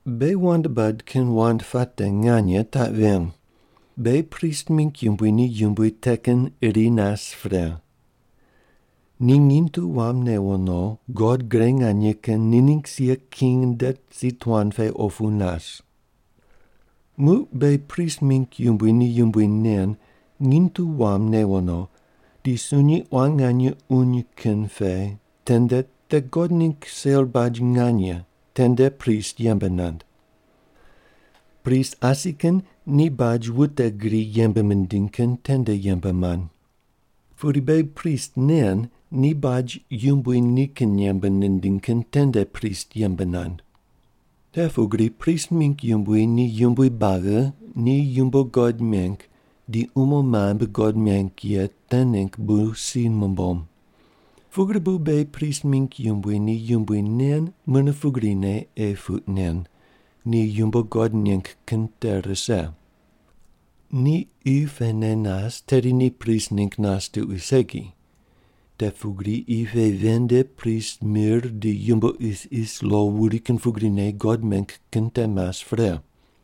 Beghi wand bad kin wand puate nganye taq ven: Beghi prist mingg yumbui ni yumbui te kin iri nas pre. Ni nginy tu wam newo no God Gre Nganye Kin ni ningg sia king nde si tuan pe opu nas. Muq beghi prist mingg yumbui ni yumbui nen nginy tu wam newo no di sunyi quan nganye uny kin pe tende te God ningg sel baj nganye tende prist yembe nand. Prist asi kin ni baj wute gri yembe mindiny kin tende yembe mand. Pudi beghi prist nen ni baj Yumbui nikin yembe nindiny kin tende prist yembe nand. Te pugri prist mingg yumbui ni yumbui buagi ni yumbo God meng di umo mambui God meng ye te ningg bu si numbom. Pugri bu beghi prist mingg yumbui ni yumbui nen mune pugrine ei puq nen, ni yumbo God neng kin te rise. Ni qi pene nas tedi ni prist ningg nas tuqui segi. Te pugri qi pe ven nde prist mir di yumbo isis lo wuri kin pugrine God meng kin te mas pre.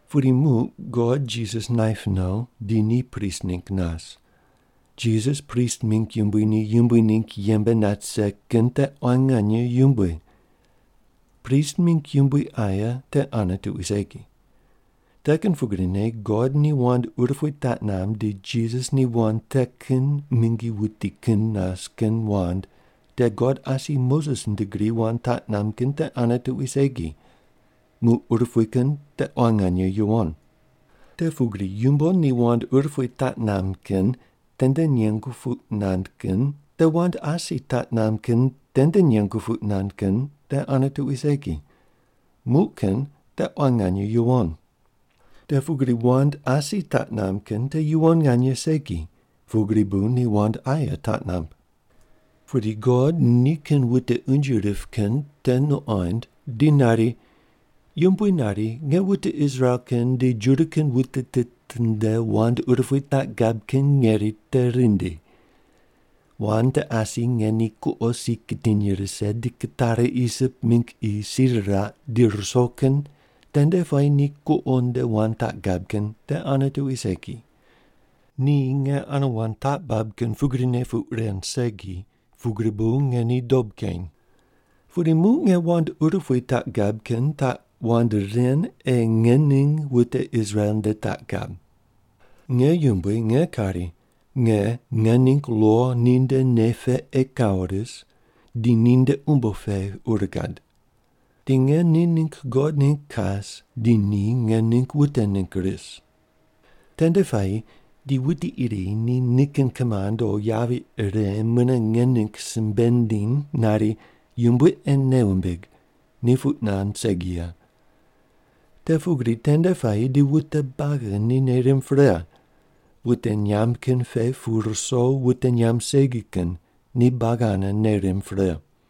Pudi muq God Jisas naip no di ni prist ningg nas. Jisas prist mingg yumbui ni yumbui ningg yembe nat rise kin te quan nganye yumbui. Prist mingg yumbui aye te ane tuqui segi. Te kin pugrine God ni wand urupui taq namb di Jisas ni wand te kin mingi wuti kin nas kin wand te God asi Moses nde gri wand taq namb kin te ane tuqui segi, muq urupui kin te quan nganye yuwon. Te pugri yumbo ni wand urupui taq namb kin tende nengu puq nand kin te wand asi taq namb kin tende nengu puq nand kin te ane tuqui segi, muq kin te quan nganye yuwon. Te pugri wand asi taq namb kin te yuwon nganye segi, pugri bu ni wand aye taq namb. Pudi God nikin wute unje rip kin te nuqond di nari, “Yumbui nari, ‘Nge wute Israel kin di Juda kin wute tit nde wand urupui taq gab kin ngeri te rindi. Wand te asi nge ni kuqo si kitiny rise di kitari Isip mingg qi si riraq di ruso kin tende puayi ni kuqo nde wand taq gab kin te ane tuqui segi. Ni nge ane wand taq bab kin pugrine puq ren segi, pugri bu nge ni dob keny. Pudi muq nge wand urupui taq gab kin taq wand ren ei nge ning wute Israel nde taq gab. Nge Yumbui nge kari, Nge nge ningg lo ni nde nei pe ei kawo ris, di ni nde umbo pe ur gad. Di nge ni ningg God ningg kas di ni nge ningg wute ningg ris’. Tende puayi di wuti iri ni nikin kimand o yavi ire mune nge ningg simbe nindiny nari, ‘Yumbui ei nei wumbig,’ ni puq nand segi ye. Te pugri tende puayi di wute buagi ni nei rimb pre. Wute nyamb kin pe pu ruso wute nyamb segi kin ni buagi ane nei rimb pre.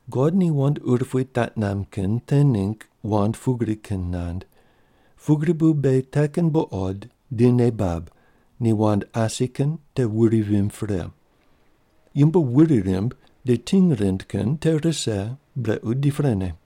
God ni wand urupui taq namb kin te ningg wand pugri kin nand, pugri bu beghi te kin buqod di nei bab ni wand asi kin te wuri vimb pre. Yumbo wuri rimb di ting rind kin te rise brequ di prene.